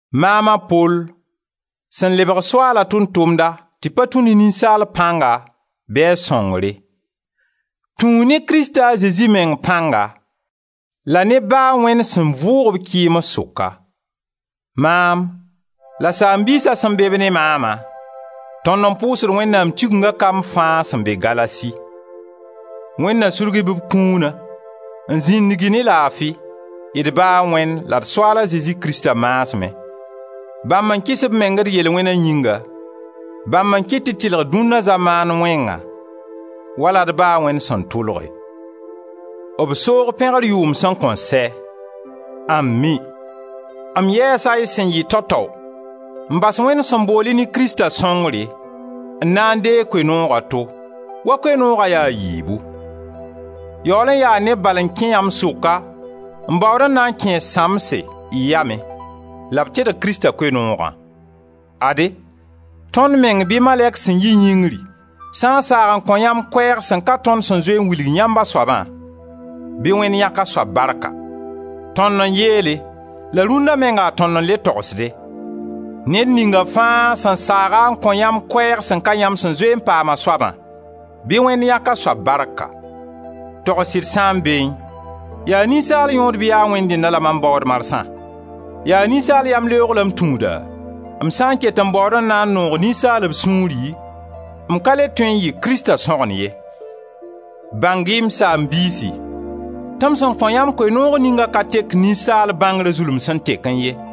Maam a Pol, sẽn lebga Soaala tʋʋm-tʋmda tɩ pa tũ ne ninsaal pãnga bɩ a sõngre: tũu ne Krista a Zezi meng pãnga la ne Ba a Wẽnd sẽn vʋʋg-b kɩɩms sʋka. Maam la saam-biisa sẽn be-b ne maama, tõnd n pʋʋsd Wẽnnaam Tigenga kamb fãa sẽn be Galasi. Wẽnd na sudg-y b kũuna, n zĩndig-y ne laafi, d Ba a Wẽnd la d Soaal a Zezi Krista maasmẽ, bãmb n kɩs b meng d yel-wẽna yĩnga, bãmb n kɩt tɩ d tɩlg dũnna zamaan wẽngã, wala d Ba a Wẽnd sẽn tʋlge. B soog pẽgr yʋʋm sẽn kõn sɛ. Ami! M yɛɛsa y sẽn yɩ tao-tao, n bas Wẽnd sẽn bool-y ne Krista sõngre, n na n deeg koe-noog a to, wa Koe-nooga ya a yiibu; yaool n yaa neb bal n kẽ yãmb sʋka n baood n na n kẽes sãmbse y yamẽ, la b tedg Krista Koe-noogã. Ade, tõnd meng bɩ malɛk sẽn yi yĩngri sã n saag n kõ yãmb koɛɛg sẽn ka tõnd sẽn zoe n wilg yãmb a soabã, bɩ Wẽnd yãk a soab barka! Tõnd n yeele la rũnda menga tõnd n le togsde: ned ninga fãa sẽn saag-a n kõ yãmb koɛɛg sẽn ka yãmb sẽn zoe n paam a soabã, bɩ Wẽnd yãk a soab barka! Togs sɩd sãn beẽ, yaa ninsaal yõod bɩ yaa Wẽnd dẽnna la mam baood marsã? Yaa ninsaal yamleoog la m tũuda? M sã n ket n baood n na n noog ninsaalb sũuri m ka le tõe n yɩ Krista sõgen ye. Bãng-y, m saam-biisi, tɩ m sẽn kõ yãmb Koe-noog ningã ka tek ninsaal bãngra zulum sẽn tekẽ ye.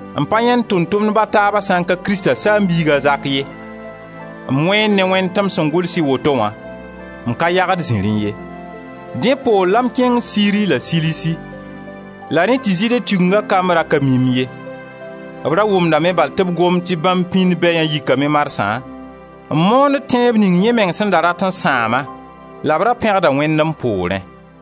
m pa yãend Tʋʋm-tʋmdb a taaba sã n ka Krista saam-biig a Zak ye. M wẽend ne Wẽnd tɩ m sẽn gʋls y woto wã, m ka yagd ziri ye. Dẽ poor la m kẽng Siri la Silisi, la rẽ tɩ Zɩɩde Tigenga kamb ra ka mi-m ye; b ra wʋmdame bal tɩ b gomd tɩ bãmb pĩnd bɛyã yikame marsã n moond tẽeb ning yẽ meng sẽn da rat n sãama, la b ra pẽgda Wẽnd m poorẽ.